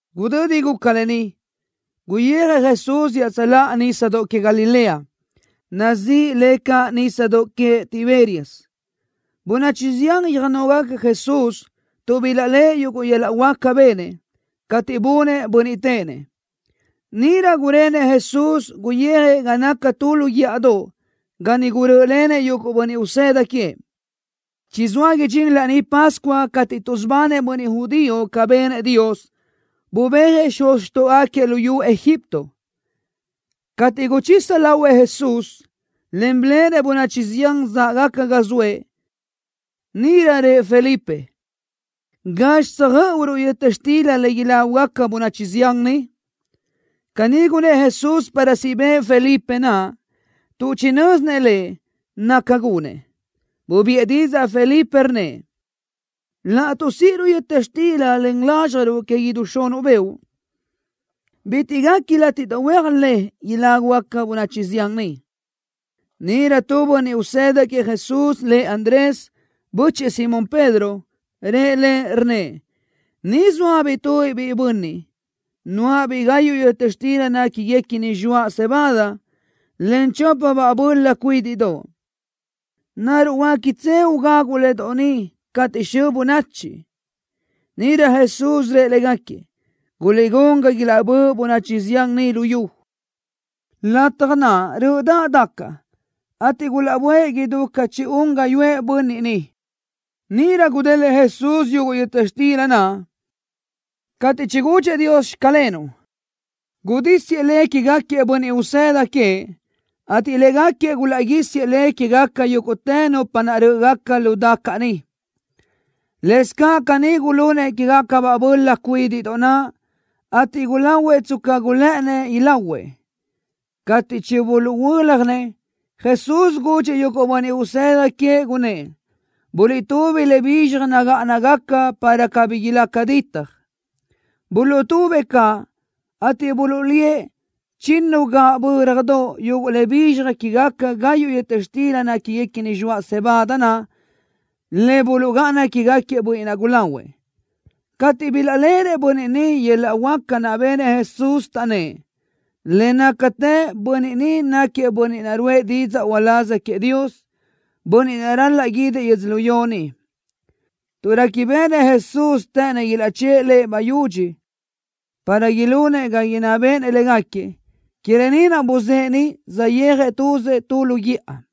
Gudödi guca lë ni, guyijëʼ Jesús iaʼtsöláʼa Nísadoʼ Que Galilea, nazíʼi le caʼ Nísadoʼ Queëʼ Tiberias. Bönachi zián yöjnógaca Jesús tuʼ bilaʼléʼe yuguʼ yöl-laʼ huáca benëʼ, cateʼ bunëʼ bönniʼ téʼenëʼ. Níʼirö gurenëʼ Jesús, guyijëʼ ga naca tu lu guíʼadoʼ, ga niʼ gurö́ʼölenëʼ yuguʼ bönniʼ usëda queëʼ. Chizóa idxín Laní Pascua cateʼ tuʼsubanëʼ bönniʼ judío ca benëʼ Dios, bubéajëʼ xuz xtóʼogaquiëʼ luyú Egipto. Cateʼ guchisa lahuëʼ Jesús, en biléʼenëʼ bönachi zián záʼgaca ga zoëʼ, níʼirö rëʼ Felipe: —¿Gazxi tsöjö́ʼuruʼ yöta xtila le ilágugaca bönachi zián ni? Caní gunnë́ʼ Jesús para siʼ bëʼë Felipe naʼ, tuʼ chinö́zinëʼ Lëʼ naca gunëʼ. Bubiʼë didzaʼ Felipe, rnnëʼ: —Laʼtuʼ síʼiruʼ yöta xtila len lázxjaruʼ que idú xunuʼ beoʼ, bitiʼ guequi látiʼdoʼ huéaj le ilágugaca bönachi zián ni. Níʼirö tu bönniʼ usëda queëʼ Jesús, lëʼ Andrés, bö́chëʼë Simón Pedro, rëʼ Lëʼ, rnnëʼ: —Ni zóabiʼ tubiʼ biʼi bönniʼ, nuáʼabiʼ gayuʼ yöta xtila néquiguequini zxoaʼ cebada, en chópabaʼ böla cuídiʼdoʼ. ¿Naruʼ huéquiʼtse ugagu le doʼ ni cateʼ xö bönachi? Níʼirö Jesús rëʼ légaquiëʼ: —Guliʼgún ga ilaʼbö́ʼ bönachi zián ni lu yu. Lataj naʼ, rö́ʼödaʼ dacaʼ, ateʼ gulaʼböʼë idú ca chi-un gáyuʼë bönniʼ niʼ. Níʼirö gudélëʼë Jesús yuguʼ yöta xtila naʼ. Cateʼ chigudxëʼ Dios: “Xclenuʼ”, gudísiëʼ le quégaquiëʼ bönniʼ usëda queëʼ, ateʼ légaquiëʼ gulaʼguísiëʼ le quégaca yúguʼtë nupa naʼ rö́ʼgaca lu dacaʼ niʼ. Lëscaʼ caní gulunëʼ quégacabaʼ böla cuídiʼdoʼ naʼ, ateʼ gulahuëʼ tsca gulë́ʼënnëʼ ilahuëʼ. Cateʼ chibuluʼhuö́ljanëʼ, Jesús gudxëʼ yuguʼ bönniʼ usëda queëʼ, gunnë́ʼ: —Buliʼtúbi le bizxaj nagáʼanagaca, para cabí ilaca ditaj. Buluʼtubëʼ caʼ, ateʼ buluʼlíëʼ chinnu gaʼbö́radoʼ yuguʼ le bizxaj quégaca gayuʼ yöta xtila néquiguequini zxoaʼ cebada naʼ, le buluʼgáʼana quégaquiëʼ bönniʼ naʼ gulahuëʼ. Cateʼ bilaʼléʼenëʼ bönniʼ niʼ yöl-laʼ huáca naʼ benëʼ Jesús, taʼnnë́ʼ: —Le nácatë bönniʼ ni náquiëʼ bönniʼ naʼ ruʼë didzaʼ uláz queëʼ Dios, bönniʼ naʼ ral-laʼ guídëʼ yödzölió ni. Tuʼ réquibeʼenëʼ Jesús të́ʼënnëʼ ilaʼchë́ʼë Lëʼ bayudxi para ilunëʼ ga inná béʼenëʼ légaquiëʼ, que lë ni naʼ buzë́ʼë niʼ, saʼyéajëʼ tuzëʼ tu lu guíʼa.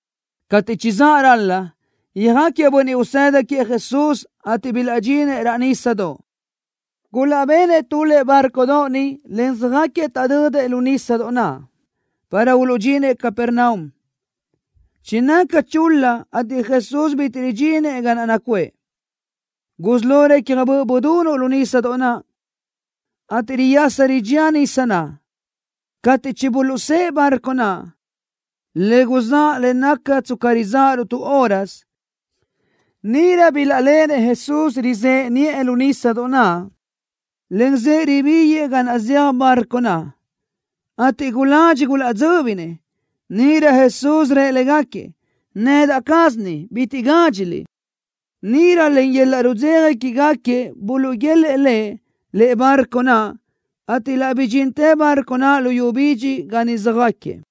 Cateʼ chizáʼ ral-la, yöjáquiëʼ bönniʼ usëda queëʼ Jesús, ateʼ bilaʼdxinëʼ raʼ nísadoʼ. Gulaʼbenëʼ tu lëʼe bárcodoʼ niʼ, en söjáquiëʼ taʼdödëʼ lu nísadoʼ naʼ, para uluʼdxinëʼ Capernaum. Chinaca chul-la ateʼ Jesús bitiʼ ridxíninëʼ ga naʼ nacuʼë. Gusí lo recja böʼ budunuʼ lu nísadoʼ naʼ, ateʼ riyasa ridxía nisa naʼ. Cateʼ chibuluʼsë́ʼë bárcodoʼ naʼ, le guzáʼ le naca tsca rizáʼaruʼ tu hórasö, níʼirö bilaʼléʼenëʼ Jesús rizëʼe niʼë lu nísadoʼ naʼ, en zëʼë ribíguëʼë ga naʼ zeaj barco naʼ, ateʼ guladxi gulaʼdzö́binëʼ. Níʼirö Jesús rëʼ légaquiëʼ: —Nedaʼ caz ni. Bitiʼ gádxiliʼ. Níʼirö len yöl-laʼ rudzeja quégaquiëʼ buluʼguélëʼë Lëʼ lëʼe bárcodoʼ naʼ, ateʼ laʼ bidxintë bárcodoʼ naʼ lu yu bidxi ga niʼ söjáquiëʼ.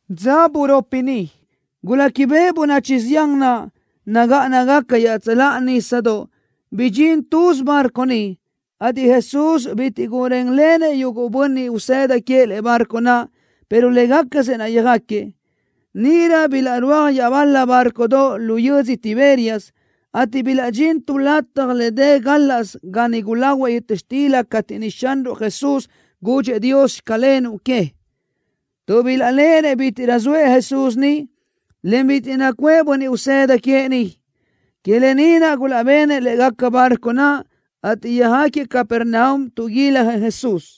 Dza buropi niʼ, guléquibeʼe bönachi zián naʼ nagáʼanagaca iaʼtsöláʼa nísadoʼ bidxín tuz bárcodoʼ niʼ, ateʼ Jesús bitiʼ gurénlenëʼ yuguʼ bönniʼ usëda queëʼ lëʼe bárcodoʼ naʼ, pero légacasëʼ naʼ yöjáquiëʼ. Níʼirö bilaʼrúaj iaʼbal-la bárcodoʼ lu yödzö Tiberias, ateʼ bilaʼdxín tu lataj le dë gálaʼsö ga niʼ gulahuëʼ yöta xtila cateʼ niʼ Xanruʼ Jesús gudxëʼ Dios: “Xclenuʼ” que. Tuʼ bilaʼléʼenëʼ bítiʼrö zoëʼ Jesús niʼ, en bitiʼ nacuʼë bönniʼ usëda queëʼ niʼ, que lë ni naʼ gulaʼbenëʼ lë́ʼegaca bárcodoʼ naʼ, ateʼ yöjáquiëʼ Capernaum, tuʼguiljëʼ Jesús.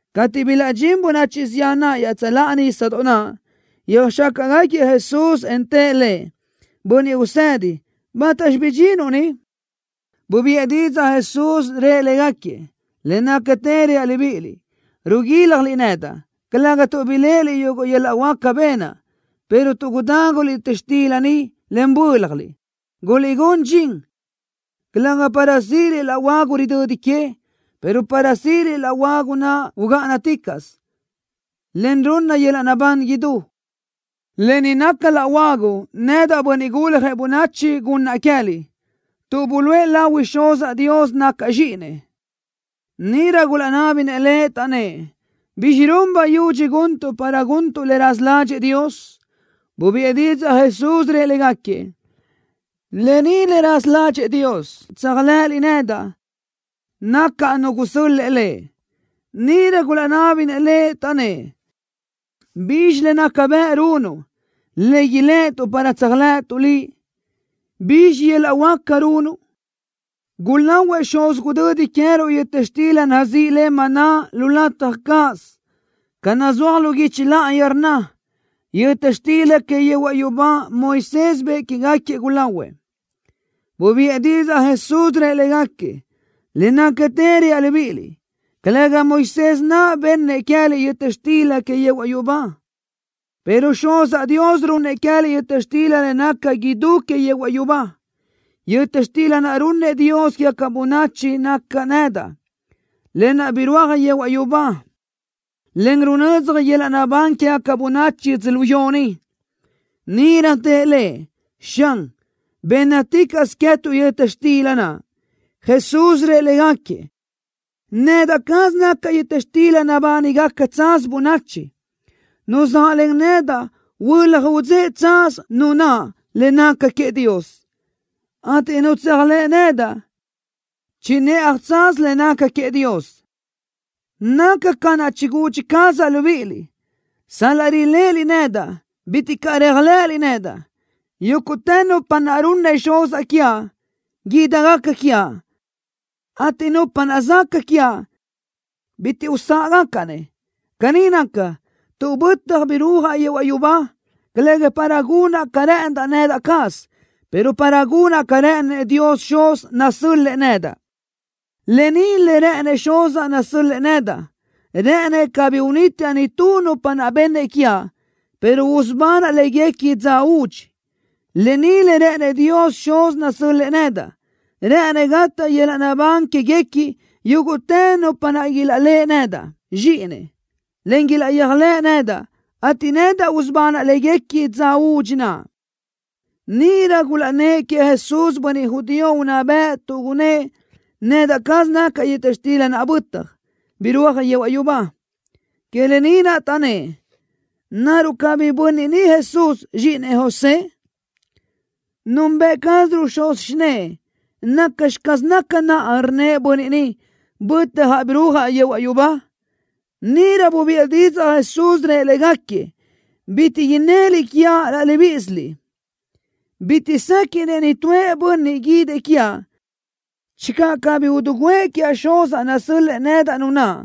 Cateʼ bilaʼdxín bönachi zián naʼ iaʼtsöláʼa nísadoʼ naʼ, yöjxácaʼgaquiëʼ Jesús, en tëʼ Lëʼ: —Bönniʼ Usedi, ¿bátaxi bidxinuʼ ni? Bubiʼë didzaʼ Jesús, rëʼ légaquiëʼ: —Le nácatë reaʼ libíʼiliʼ: Ruguílajliʼ nedaʼ, calëga tuʼ biléʼeliʼ yuguʼ yöl-laʼ huáca benaʼ, pero tuʼ gudáguliʼ yöta xtila niʼ, en bö́ljaliʼ. Guliʼgún dxin, calëga para síʼiliʼ laʼ huagu ridödi que, pero para síʼiliʼ laʼ huagu naʼ ugáʼanaticaʼsö, en runna yöl-laʼ naʼbán idú. Lë ni naca laʼ huagu nedaʼ, Bönniʼ Guljëʼ Bönachi, gunnaʼ queë́liʼ, tuʼ buluʼë lahui Xuzaʼ Dios nacaʼ Zxíʼinëʼ. Níʼirö gulaʼnábinëʼ Lëʼ, taʼnnë́ʼ: —¿Bizxi run bayudxi guntuʼ para guntuʼ le raza ládxëʼë Dios? Bubiʼë didzaʼ Jesús, rëʼ légaquiëʼ: —Lë ni le raza ládxëʼë Dios, tséajlëʼëliʼ nedaʼ, nacaʼ nu gusö́l-lëʼë Lëʼ. Níʼirö gulaʼnábinëʼ Lëʼ, taʼnnë́ʼ: —¿Bizxi le naca bëʼ runuʼ, le iléʼetuʼ para tséajlëʼëtuʼ Liʼ? ¿Bizxi yöl-laʼ huáca runuʼ? Gulahuëʼ xuz gudödi queëruʼ yöta xtila nazíʼi le maná lu lataj cáʼasö, ca nazúaj lu guichi láʼayi, rnna: “Yöta xtila que yehuaʼ yubá Moisés bëʼë quégaquiëʼ, gulahuëʼ.” Bubiʼë didzaʼ Jesús, rëʼ légaquiëʼ: —Le nácatë reaʼ libíʼiliʼ: Calëga Moisés naʼ bennëʼ queë́liʼ yöta xtila que yehuaʼ yubá, pero Xuzaʼ Dios runnëʼ queë́liʼ yöta xtila le naca idú que yehuaʼ yubá. Yöta xtila naʼ runnëʼ Dios quégaca bönachi nacaʼ nedaʼ, lë naʼ birúaj yehuaʼ yubá, en runödzaj yöl-laʼ naʼbán quégaca bönachi yödzölió ni. Níʼirö tëʼ Lëʼ: —Xan, bénnaticaʼsö queë́tuʼ yöta xtila naʼ. Jesús rëʼ légaquiëʼ: —Nedaʼ caz nacaʼ yöta xtila nabánigaca tsaz bönachi. Nu zaʼlen nedaʼ, huölaj udzéʼe tsaz nu naʼ le naca queëʼ Dios, ateʼ nu tséajlëʼ nedaʼ, chinëʼaj tsaz le naca queëʼ Dios. Naca ca naʼ chigudxi cazaʼ libíʼiliʼ: “Sal-laʼ riléʼeliʼ nedaʼ, bitiʼ caʼ réajlëʼëliʼ nedaʼ.” Yúguʼtë nupa naʼ runnëʼ Xuzaʼ quiaʼ, ídigaca quiaʼ, ateʼ nupa naʼ zaca quiaʼ, bitiʼ usáʼgacaʼ-nëʼ. Caní naca, tuʼ bötjaʼ birúajaʼ yehuaʼ yubá, calëga para gunaʼ ca rë́ʼëndaʼ nedaʼ caz, pero para gunaʼ ca rë́ʼënëʼ Dios Xuz, nasö́l-lëʼë nedaʼ. Lë ni le rë́ʼënëʼ Xuzaʼ nasö́l-lëʼë nedaʼ, rë́ʼënëʼ cabí unítiaʼ nitú nupa naʼ bennëʼ quiaʼ, pero usubanaʼ léguequi dza údxi. Lë ni le rë́ʼënëʼ Dios Xuz nasö́l-lëʼë nedaʼ, rë́ʼënëʼ gataʼ yöl-laʼ naʼbán quéguequi, yúguʼtë nupa naʼ ilaʼléʼe nedaʼ, Zxíʼinëʼ, en ilaʼyéajlëʼ nedaʼ, ateʼ nedaʼ usubanaʼ léguequi dza údxi naʼ. Níʼirö gulaʼnnë́ʼ queëʼ Jesús bönniʼ judío unná bëʼ tuʼ gunnë́ʼ: “Nedaʼ caz nacaʼ yöta xtila naʼ bötaj, birúaj yehuaʼ yubá.” Que lë ni naʼ taʼnnë́ʼ: —¿Naruʼ cabí bönniʼ ni Jesús, zxíʼinëʼ José? Nunbëʼ cázaruʼ xuz xinë́ʼë. ¿Nacxi caz naca naʼ, rnnëʼ bönniʼ ni: “Bötjaʼ birúajaʼ yehuaʼ yubá”? Níʼirö bubiʼë didzaʼ Jesús, rëʼ légaquiëʼ: —Bitiʼ innëliʼ quiaʼ laʼ libíʼisiliʼ. Bitiʼ séquiʼnëʼ nitúëʼ bönniʼ guídëʼ quiaʼ channö cabí idiguʼë quiaʼ Xuzaʼ nasö́l-lëʼë nedaʼ nu naʼ,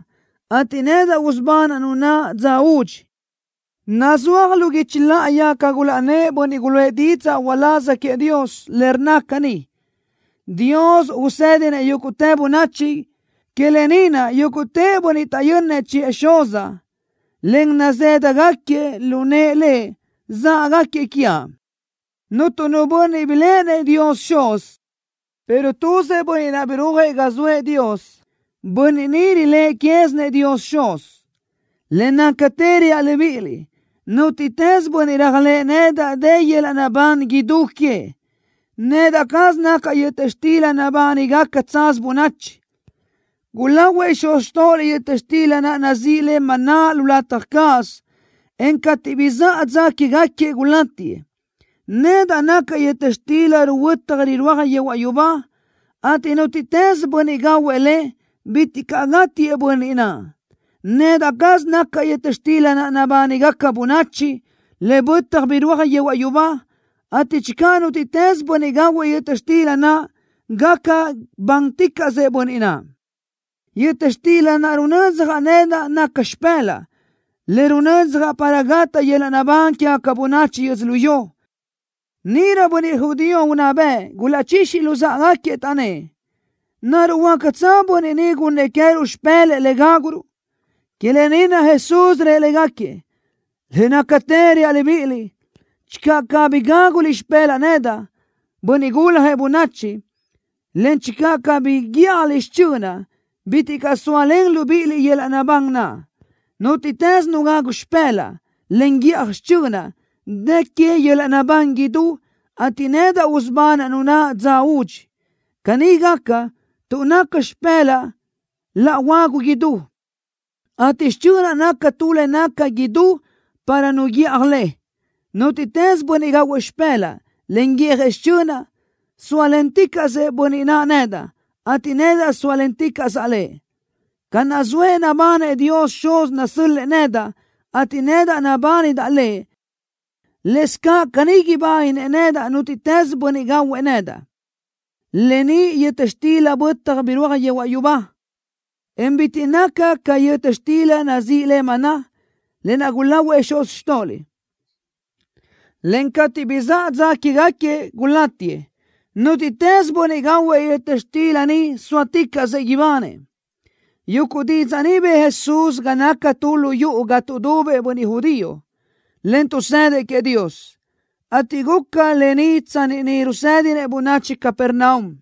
ateʼ nedaʼ usubanaʼ nu naʼ dza údxi. Nazúaj lu guichi láʼayi ca gulaʼnnë́ʼ bönniʼ guluʼë didzaʼ uláz queëʼ Dios, le rnna caní: Dios usédinëʼ yúguʼtë bönachi. Que lë ni naʼ, yúguʼtë bönniʼ taʼyönnëʼ chiʼë Xuzaʼ, en nazë́dagaquiëʼ lu nëʼë Lëʼ záʼgaquiëʼ quiaʼ. ’Cuntu nu bönniʼ biléʼenëʼ Dios Xuz, pero tuzëʼ Bönniʼ naʼ birúajëʼ ga zoëʼ Dios. Bönniʼ ni riléʼe quézinëʼ Dios Xuz. Le nácatë reaʼ libíʼiliʼ: Nútiʼtës bönniʼ réajlëʼë nedaʼ dë yöl-laʼ naʼbán idú queëʼ. Nedaʼ caz nacaʼ yöta xtila nabánigaca tsaz bönachi. Gulahuëʼ xuz xtóʼoliʼ yöta xtila naʼ nazíʼi le maná lu lataj cáʼasö, en cateʼ bizáʼa dza quégaquiëʼ gulátiëʼ. Nedaʼ nacaʼ yöta xtila ruhuötaj rirúaj yehuaʼ yubá, ateʼ nútiʼtës bönniʼ gahuëʼ le, bitiʼ caʼ gátiëʼ bönniʼ naʼ. Nedaʼ caz nacaʼ yöta xtila naʼ nabánigaca bönachi, le bötaj birúaj yehuaʼ yubá, ateʼ channö nútiʼtës bönniʼ gahuëʼ yöta xtila naʼ, gaca bánticaʼsëʼ bönniʼ naʼ. Yöta xtila naʼ runödzjaʼ nedaʼ naca xipë́laʼa, le runödzjaʼ para gataʼ yöl-laʼ naʼbán quégaca bönachi yödzölió. Níʼirö bönniʼ judío unná bëʼ gulaʼchixi luzáʼagaquiëʼ, taʼnnë́ʼ: —¿Naruʼ huácatsö bönniʼ ni gunnëʼ queë́ruʼ xipë́lëʼë le gáguruʼ? Que lë ni naʼ Jesús rëʼ légaquiëʼ: —Le nácatë reaʼ libíʼiliʼ: Channö cabí gáguliʼ xipë́laʼa nedaʼ, Bönniʼ Guljëʼ Bönachi, en channö cabí guíʼjaliʼ xichönaʼ, bitiʼ caʼ zóalen libíʼiliʼ yöl-laʼ naʼbán naʼ. Nútiʼtës nu gagu xipë́laʼa, en guíʼaj xichönaʼ, dë que yöl-laʼ naʼbán idú, ateʼ nedaʼ usubanaʼ nu naʼ dza údxi. Caní gaca, tuʼ naca xipë́laʼa laʼ huagu idú, ateʼ xichönaʼ naca tu le naca idú para nu guíʼaj le. Nútiʼtës bönniʼ gahuëʼ xipë́laʼa, en guíʼjëʼ xichönaʼ, sóalenticaʼsëʼ bönniʼ naʼ nedaʼ, ateʼ nedaʼ sóalenticaʼsaʼ lëʼ. Ca naʼ zoëʼ nabanëʼ Dios Xuz nasö́l-lëʼë nedaʼ, ateʼ nedaʼ nabánidaʼ Lëʼ, lëscaʼ caní ibáninëʼ nedaʼ nútiʼtës bönniʼ gahuëʼ nedaʼ. Lë ni yöta xtila bötaj birúaj yehuaʼ yubá, en bitiʼ naca ca yöta xtila naʼ nazíʼi le maná, lë naʼ gulahuëʼ xuz xtóʼoliʼ, en cateʼ bizáʼa dza quégaquiëʼ, gulátiëʼ. Nútiʼtës bönniʼ gahuëʼ yöta xtila ni sóaticaʼsëʼ ibanëʼ. Yuguʼ didzaʼ ni bëʼë Jesús ga naca tu lu yuʼu ga tuʼdubëʼ bönniʼ judío, en tuʼsëdëʼ queëʼ Dios, ateʼ guca lë ni tsanni niʼ rusédinëʼ bönachi Capernaum.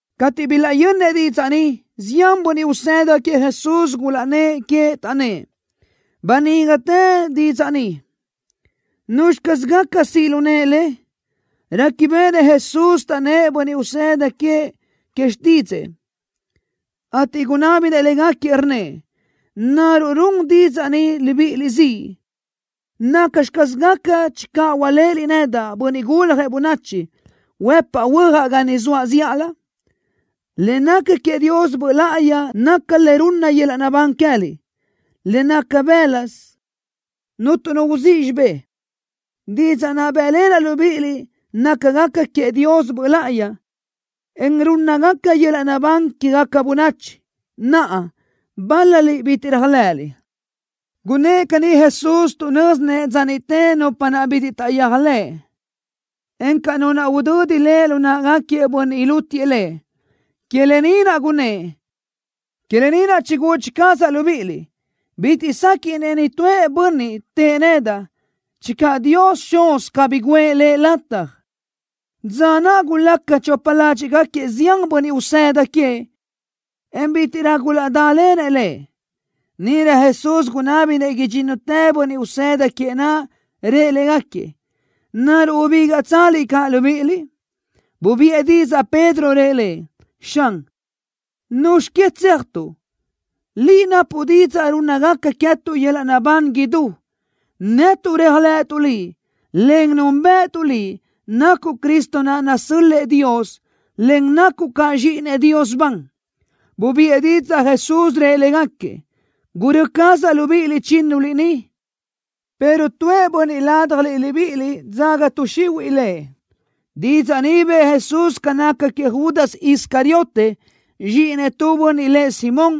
Cateʼ bilaʼyönnëʼ didzaʼ ni, zián bönniʼ usëda queëʼ Jesús gulaʼnnë́ʼ que, taʼnnë́ʼ: —Banígatë didzaʼ ni. ¿Nuzxi caz gaca siʼ lu nëʼe le? Réquibeʼenëʼ Jesús taʼnnë́ʼ bönniʼ usëda queëʼ que xtídzëʼë, ateʼ gunábinëʼ légaquiëʼ, rnnëʼ: —¿Naruʼ run didzaʼ ni libíʼiliʼ ziʼ? ¿Nacxi caz gaca channö hualéʼeliʼ nedaʼ, Bönniʼ Guljëʼ Bönachi, huëpaʼ huöjaʼ ga niʼ zoaʼ zíʼalö? Le naca queëʼ Dios Böʼ Láʼayi naca le runna yöl-laʼ naʼbán queë́liʼ. Le naca bë́laʼsö cuntu nu uzíʼ xibé. Didzaʼ naʼ bë́ʼlenaʼ libíʼiliʼ nácagaca queëʼ Dios Böʼ Láʼayi, en rúnnagaca yöl-laʼ naʼbán quégaca bönachi. Naʼa, bál-laliʼ bitiʼ réajlëʼëliʼ. Gunnë́ʼ caní Jesús tuʼ nö́zinëʼ dza niʼte nupa naʼ bitiʼ taʼyéajlëʼ, encaʼ nu naʼ udödi Lëʼ lu náʼagaquiëʼ bönniʼ ilútiëʼ Lëʼ. Que lë ni naʼ gunnë́ʼ: —Que lë ni naʼ chigudxi cazaʼ libíʼiliʼ: Bitiʼ séquiʼnëʼ nitúëʼ bönniʼ tëʼë nedaʼ channö Dios Xuz cabí guʼë lëʼ lataj. Dza naʼ gulaca chopa ládxiʼgaquiëʼ zián bönniʼ usëda queëʼ, en bítiʼrö gulaʼdálenëʼ Lëʼ. Níʼirö Jesús gunábinëʼ idxínnutëʼ bönniʼ usëda queëʼ naʼ, rëʼ légaquiëʼ: —¿Naruʼ ubígaʼtsaliʼ caʼ libíʼiliʼ? Bubiʼë didzaʼ Pedro, rëʼ Lëʼ: —Xan, ¿nuzxi que tséajtuʼ? Liʼ napuʼ didzaʼ rúnnagaca queë́tuʼ yöl-laʼ naʼbán idú. Netuʼ réajlëʼëtuʼ Liʼ, en núnbëʼëtuʼ Liʼ, nacuʼ Cristo naʼ nasö́l-lëʼë Dios, en nacuʼ caʼ Zxíʼinëʼ Dios ban. Bubiʼë didzaʼ Jesús, rëʼ légaquiëʼ: —Gurö́ cazaʼ libíʼiliʼ chínnuliʼ ni, pero tuëʼ bönniʼ ládajliʼ libíʼiliʼ dzaga tuʼ xihuiʼ lëʼ. Didzaʼ ni bëʼë Jesús ca naca queëʼ Judas Iscariote, zxíʼinëʼ tu bönniʼ lëʼ Simón,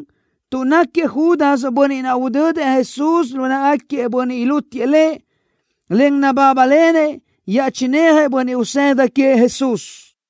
tuʼ náquiëʼ Judas bönniʼ naʼ udödëʼ Jesús lu náʼagaquiëʼ bönniʼ ilútiëʼ Lëʼ, en nabábalenëʼ iaʼchinéajëʼ bönniʼ usëda queëʼ Jesús.